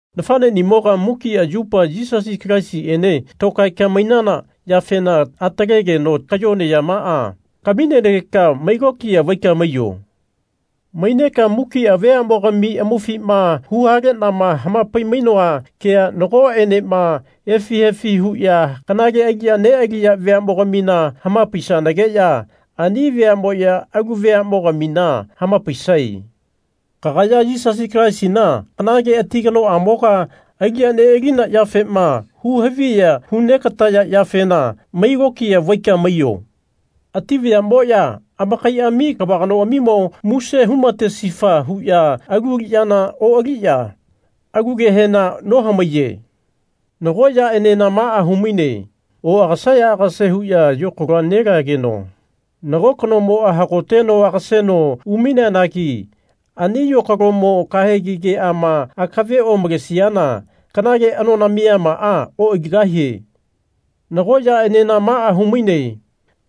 Nafanenimoga mukia yupa Yisasi Kalaisiene tokaeka mainana yafena atalegeno kayone yamaa kaminenageka mai lokiya vaika maiyo. Maineka mukia veamogami amaufima huhalenama hamapai-mainoa kea nagoenema efi efi huya kanale aliya nealiya veamogamina hamapaisanageya ani veamoya alu veamogamina hamapaisae. Kagaya Yisasi Kalaisina kanale ati kanoamoga aliya nealina yafema hu haviya hu negataya yafena mai lokiya vaika maiyo. Ati vayamoya amakaiami kava kanoamimo muse humatesifa huya alu aliyana oaliya alu kehena nohamaiye. Nago yaenena maa humaine oagase aagase huya yokalo nelageno nago kanomoa hagoteno agaseno umaineanagi ani yokalomo kahegi keama akave omalesiana kanale anona miyamaa oaligahie. Nago yaenena maa humaine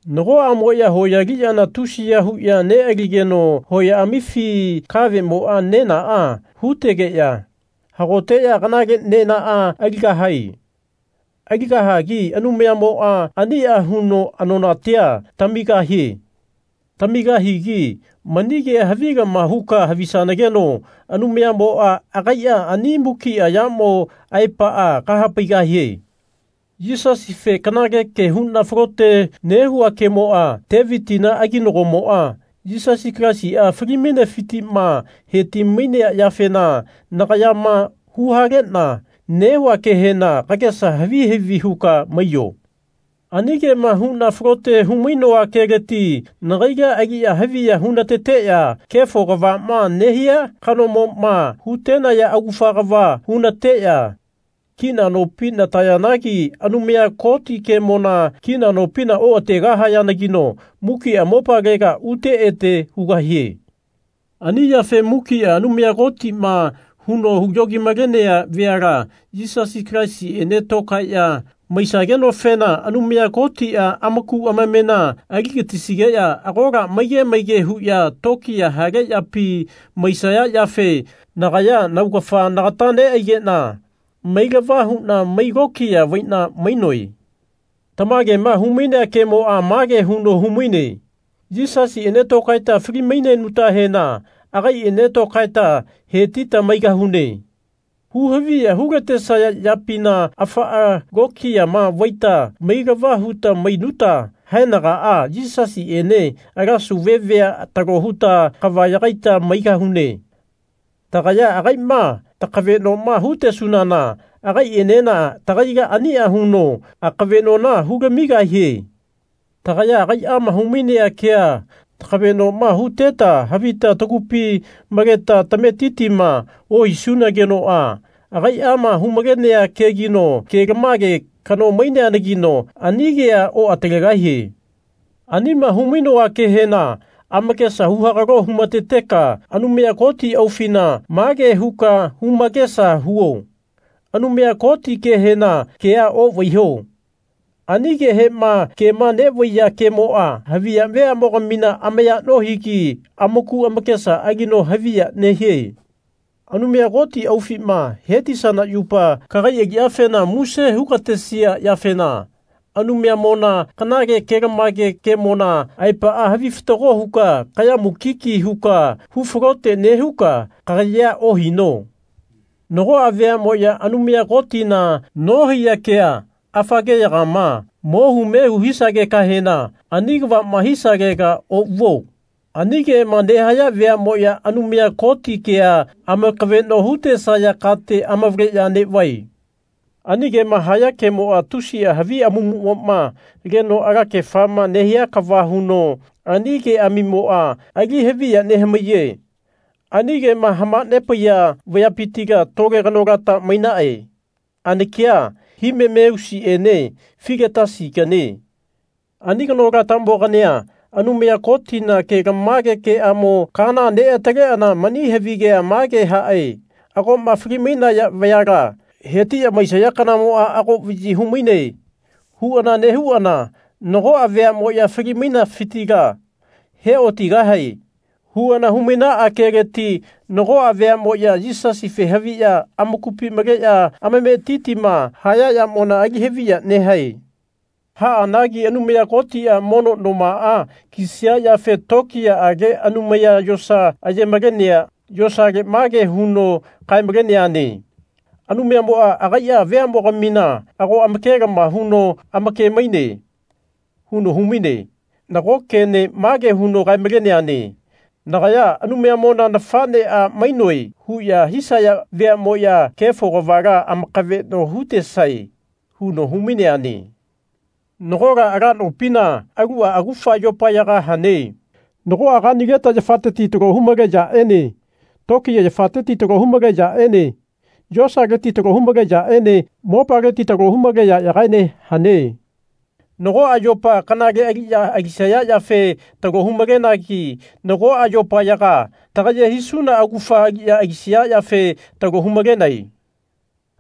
nagoamoya hoya aliyana tusiya huya nealigeno hoyaamifi kavemoa nena hutegeya hagoteya kanale nenaa aligahae. Aligahagi Anumayamoa ania huno anonatia tamigahie. Tamigahigi mani kea havilama huka havisanageno Anumayamoa agaia ani mukia yamo aepaa kahapaigahie. Yisasife kanale ke huna falote nehua kemoa Tevitina aginagomoa Yisasi Kalaisia fali-mainefitima heti-mainea yafena nagayama huhalena nehua kehena kagesa havi havi huka maiyo. Ani kema huna falote hu-mainoa keleti nagaila aliya haviya hunateteya kefo kavama nehia kanomoma hutenaya augafa kava hunateya kina nopi natayanagi Anumaya Koti kemona kina nopina oategahayanagino mukia mopalega ute ete hugahie. Ani yafe mukia Anumaya Kotima huno yogi-malenea veala Yisasi Kalaisiene tokaeya maisagenofena Anumaya Kotia amaku amamena aligatisigeya agola maige maige huya tokiya hale yapi maisaya yafe nagaya naugafa nagata neaigena mailava huna mai lokiya vaina mainoe. Tamagema humainea kemoa mage huno humaine Yisasiene tokaeta fali-mainenutahena agaiene tokaeta hetita maigahune. Huhaviya hulatesaya yapina afaa lokiyama vaita mailava huta mainuta haenagaa Yisasiene ala sauve vea talo huta kava yagaita maigahune. Tagaya agaima takavenoma hutesunana agaienena tagaila ania huno akaveno hulamigahie. Tagaya agaiama humainea kea takavenoma huteta havita tagupi maleta tametitima ohisunagenoa agaiama hu-malenea kegino kelamage kano maineanagino ani kea oatalegahie. Anima humainoa kehena amakesa huhagalo humateteka Anumaya Koti aufina mage huka humakesa huo. Anumaya Koti kehena kea ovaiho. Ani kehema kema nevaiya kemoa haviya veamogamina amaya nohigi amaku amakesa alino haviya nehie. Anumaya Koti aufima hetisana yupa kagai aliyafena muse hugatesia yafena Anumayamona kanale kelamage kemona aepaa havi fatago huka kaya mukiki huka hu falote nehuka kagayea ohino. Nagoa veamoya Anumaya Kotina nohaiya kea, afa keyagama, mohu mehu hisagekahena ani kavama hisalega ovuo. Ani kema nehaya veamoya Anumaya Koti kea amakaveno hutesaya kate amavaleya nevae. Ani kema haya kemoa tusia havi amamumoma leno alakefama nehia kava huno ani keamimoa ali haviya nehamaiye. Ani kema hamanepaiya vayapitila tole kanolata mainae anakia Himeneusiene Filetasiganie. Ani kanolata-mogania Anumaya Kotina kelamage keamo kaana neataleana mani havigea mage hae Agoma fali-mainaya vayala hetiya maisaya kanamoa ago vayi humaine. huana nehuana Nagoa veamoya fali-mainesafitila he otigahae. huana humainaa keleti nagoa veamoya Yisasife haviya amakupi maleya amametitima haya yamona ali haviya nehae. Haanagi Anumaya Kotia mono nomaa kisia yafe tokiyaage anumaya yosa aye-malenea yosale mage huno kae-maleneane Anumayamoa agaia veamogamina ago amakelama huno amake-maine. huno humaine. Nago kene mage huno kae-maleneane Nagaya Anumayamona nafanea mainoe huya hisaya veamoya kefo kavala amakaveno hutesae. huno humaineane. Nagola ala nopina alua augafa yopayaga hane. Nagoa kanileta yafateti talo humale yaene tokiya yafateti talo humale yaene yosaleti talo humale yaene mopaleti talo humale yayagaene hane. Nagoa yopa kanale aliya alisaya yafe talo hu-malenagi nagoa yopayaga tagaye hisuna augafa aliya alisaya yafe talo hu-malenae.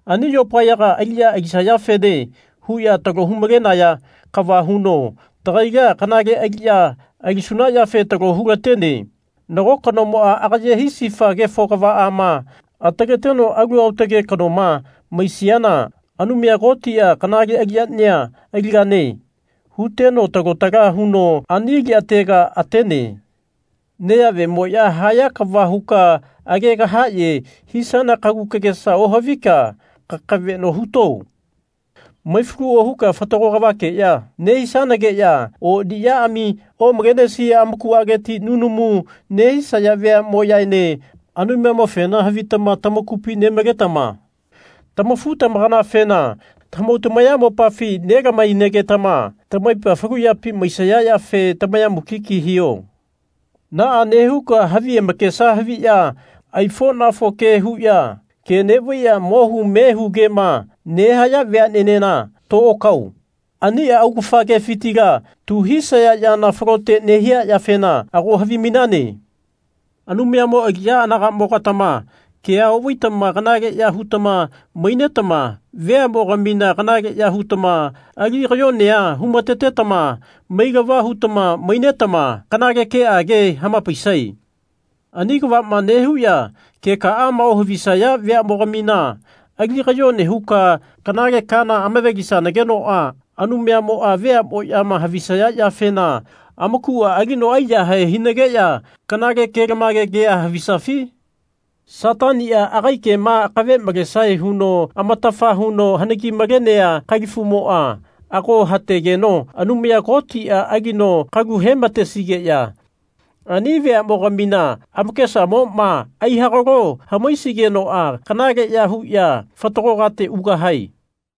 Ani yopayaga aliya alisayafene huya talo humalenaya kava huno tagaila kanale aliya alisuna yafe talo hulatene. Nago kanomoa agaye hisifa kefo kavaama ataleteno alu aotage kanoma maisiana Anumaya Kotia Kanale aliyania aligane. huteno talo tala huno ani aliyatega atene. Neyavemoya haya kava huka age kahaye hisana kagu kagesa ohavika kakaveno huto. Maifalu ohuka fatago kavakeya nehisanageya oniyaami omalenesia amakualeti nunamu nehisaya veamoyaene Anumayamofena havitama tamakupi nemaletama tamafu tamakanafena tamahau tamayamopafi nelama-hainagetama tamaipa falu yapi maisaya yafe tamaya mukiki hiho. Naa nehuka havi amakesa haviya aifonafo ke huya ke nevaiya mo hu me hu kema nehaya veanenena to okao. Ania augafa kefitila tu hisaya yana falote nehia yafena ago havimainane. Anumayamo aliya anagamo-gatama kea ovaitama kanaleya hutama mainetama veamogamina kanaleya hutama ali kayonea humatetama mailama hutama mainetama kanale keage hamapaisae. Ani kavama nehuya kekaama ohavisaya veamogamina ali kayone huka kanale kaana amave-lisanagenoa Anumayamoa veamoyama havisaya yafena amakua alino aiyahae hinageya kanale kelamage kea havisafi? Satania agai kema akave malesae huno amatafa huno hanagi malenea kalifumoa ago hategeno Anumaya Kotia alino kalu hematesigeya ani veamogamina amakesamoma aihagalo hamaisigenoa kanaleya huya fatago kate ugahae.